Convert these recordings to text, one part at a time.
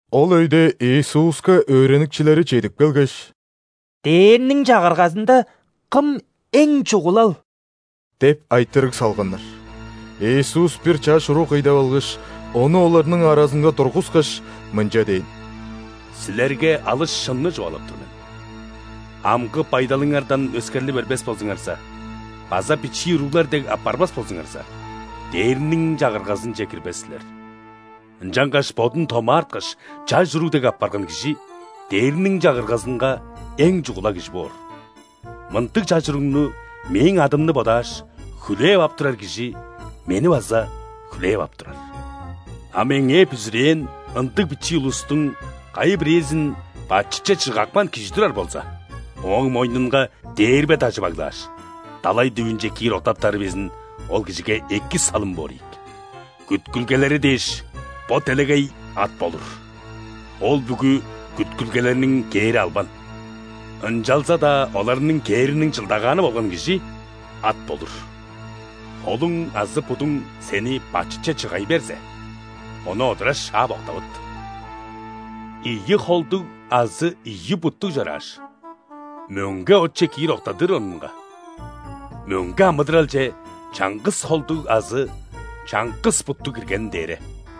Ол өйде Иисуска өөреникчилери чедип келгеш: «Дээрниң Чагыргазында кым эң чугулал?» – деп айтырыг салганнар. Иисус бир чаш уруг кый деп алгаш, ону оларның аразынга тургускаш, мынча дээн: «Силерге алыс шынны чугаалап тур мен: амгы байдалыңардан өскерли бербес болзуңарза база бичии уруглар дег апарбас болзуңарза, Дээрниң Чагыргазынче кирбес силер. Ынчангаш бодун томаарткаш, чаш уруг дег апарган кижи Дээрниң Чагыргазынга эң чугула кижи боор. Мындыг чаш уругну Мээң адымны бодааш, хүлээп ап турар кижи Мени база хүлээп ап турар. А Меңээ бүзүрээн ындыг бичии улустуң кайы-бирээзин бачытче чыгапкан кижи турар болза, ооң мойнунга дээрбе дажы баглааш, далай дүвүнче киир октаптары безин ол кижиге эки салым боор ийик. Күткүлгелери дээш, бо делегей ат болур! Ол бүгү күткүлгелерниң кээри албан, ынчалза-даа оларның кээриниң чылдагааны болган кижи ат болур! Холуң азы будуң сени бачытче чыгай берзе, ону одура шаап, октавыт! Ийи холдуг азы ийи буттуг чорааш, мөңге отче киир октадыр орнунга, мөңге амыдыралче чаңгыс холдуг азы чаңгыс буттуг киргени дээре.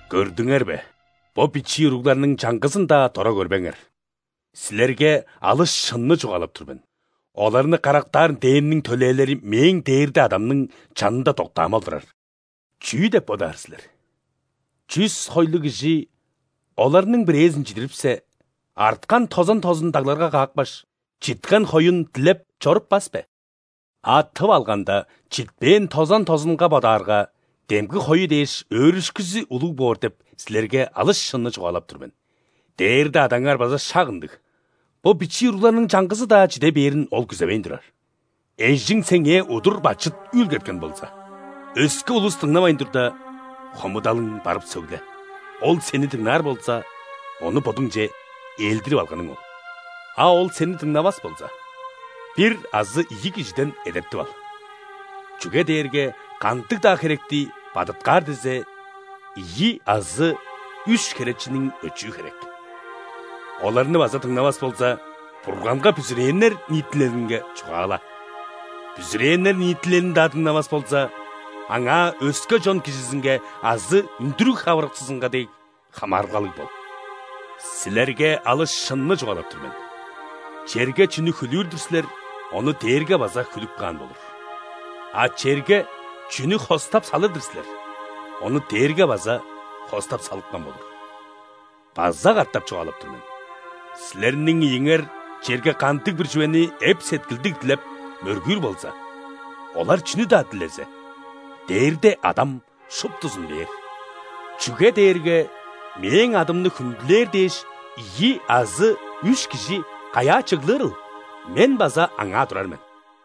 «Көрдүңер бе, бо бичии уругларның чаңгызын-даа дора көрбеңер. Силерге алыс шынны чугаалап тур мен: оларны карактаан ·дээрниң төлээлери Мээң дээрде Адамның чанында доктаамал турар. Чүү деп бодаар силер? Чүс хойлуг кижи оларның бирээзин чидирипсе, арткан тозан тозун дагларга каапкаш, читкен хоюн дилеп чоруппас бе? А тып алганда, читпээн тозан тозунга бодаарга, демги хою дээш өөрүшкүзү улуг боор деп силерге алыс шынны чугаалап тур мен. Дээрде Адаңар база шак ындыг: бо бичии уругларның чаңгызы-даа чиде бээрин Ол күзевейн турар». «Эжиң сеңээ удур бачыт үүлгеткен болза, өске улус дыңнавайн турда, хомудалың барып сөгле. Ол сени дыңнаар болза, ону бодуңче ээлдирип алганың ол. А ол сени дыңнавас болза, бир азы ийи кижиден эдертип ал, чүге дээрге кандыг-даа херекти бадыткаар дизе, ийи азы үш херечиниң өчүү херек. Оларны база дыңнавас болза, Бурганга бүзүрээннер ниитилелинге чугаала. Бүзүрээннер ниитилелин-даа дыңнавас болза, аңаа өске чон кижизинге азы үндүрүг хавырыкчызынга дег хамаарылгалыг бол. Силерге алыс шынны чугаалап тур мен: черге чүнү хүлүүр-дүр силер, ону дээрге база хүлүп каан болур; а черге чүнү хостап салыр-дыр силер, ону дээрге база хостап салыпкан болур. База катап чугаалап тур мен: силерниң ийиңер черге кандыг-бир чүвени эп-сеткилдиг дилеп, мөргүүр болза, олар чүнү-даа дилезе, Дээрде Адам шуптузун бээр. Чүге дээрге Мээң адымны хүндүлээр дээш ийи азы үш кижи каяа чыглырыл, Мен база аңаа турар мен».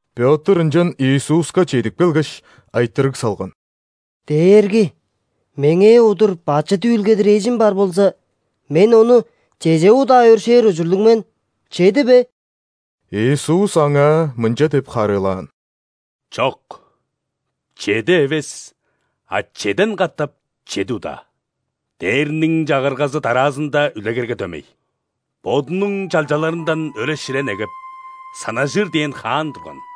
Пётр ынчан Иисуска чедип келгеш, айтырыг салган: «Дээрги, меңээ удур бачыт үүлгедир эжим бар болза, мен ону чеже удаа өршээр ужурлуг мен? Чеди бе?» Иисус аңаа мынча деп харыылаан: «Чок, чеди эвес, а чеден катап чеди удаа. Дээрниң Чагыргазы дараазында үлегерге дөмей. Бодунуң чалчаларындан өре-шире негеп, санажыр дээн хаан турган.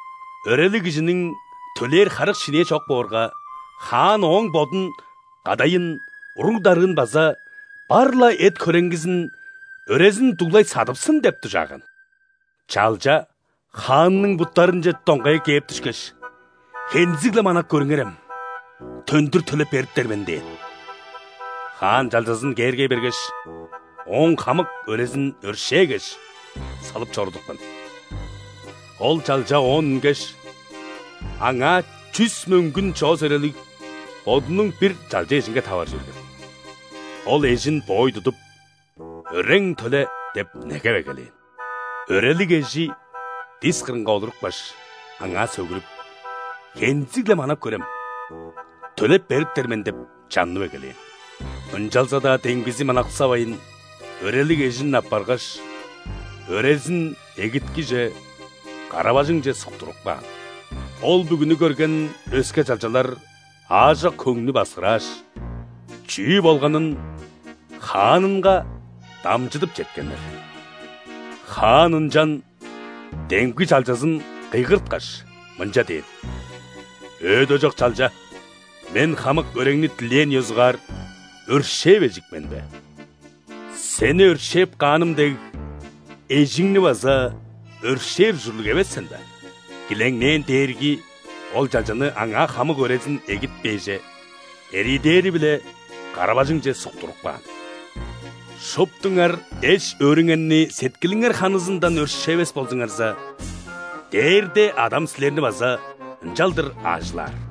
Өрелиг кижиниң төлээр харык-шинээ чок боорга, хаан ооң бодун, кадайын, уруг-дарыын база бар-ла эт-хөреңгизин өрезин дуглай садыпсын деп дужааган. Чалча хаанның буттарынче доңгая кээп дүшкеш: „Хензиг-ле манап көрүңерем! Төндүр төлеп бериптер мен!“ – дээн. Хаан чалчазын кээргей бергеш, ооң хамык өрезин өршээгеш, салып чорудупкан. А ол чалча оон үнгеш, аңаа чүс мөңгүн чоос өрелиг бодунуң бир чалча эжинге таваржы берген. Ол эжин боой тудуп: „Өрең төле!“ – деп негеп эгелээн. Өрелиг эжи дис кырынга олурупкаш, аңаа сөгүрүп: „Хензиг-ле манап көрем! Төлеп бериптер мен!“ – деп чаннып эгелээн. Ынчалза-даа демгизи манаксавайн, өрелиг эжин аппаргаш, өрезин эгиткиже, кара-бажыңче суктуртуп каан. Ол бүгүнү көрген өске чалчалар аажок хөңнү баксырааш, чүү болганын хаанынга дамчыдып четкеннер. Хаан ынчан демги чалчазын кыйгырткаш, мынча дээн: „Өөдежок чалча! Мен хамык өреңни дилээң ёзугаар өршээвежик мен бе?! Сени өршээп кааным дег, эжиңни база өршээр ужурлуг эвес сен бе?“ Килеңнээн дээрги ол чалчаны аңаа хамык өрезин эгитпээже эриидээри-биле кара-бажыңче суктуртуп каан. Шуптуңар эш-өөрүңерни сеткилиңер ханызындан өршээвес болзуңарза, Дээрде Адам силерни база ынчалдыр аажылаар».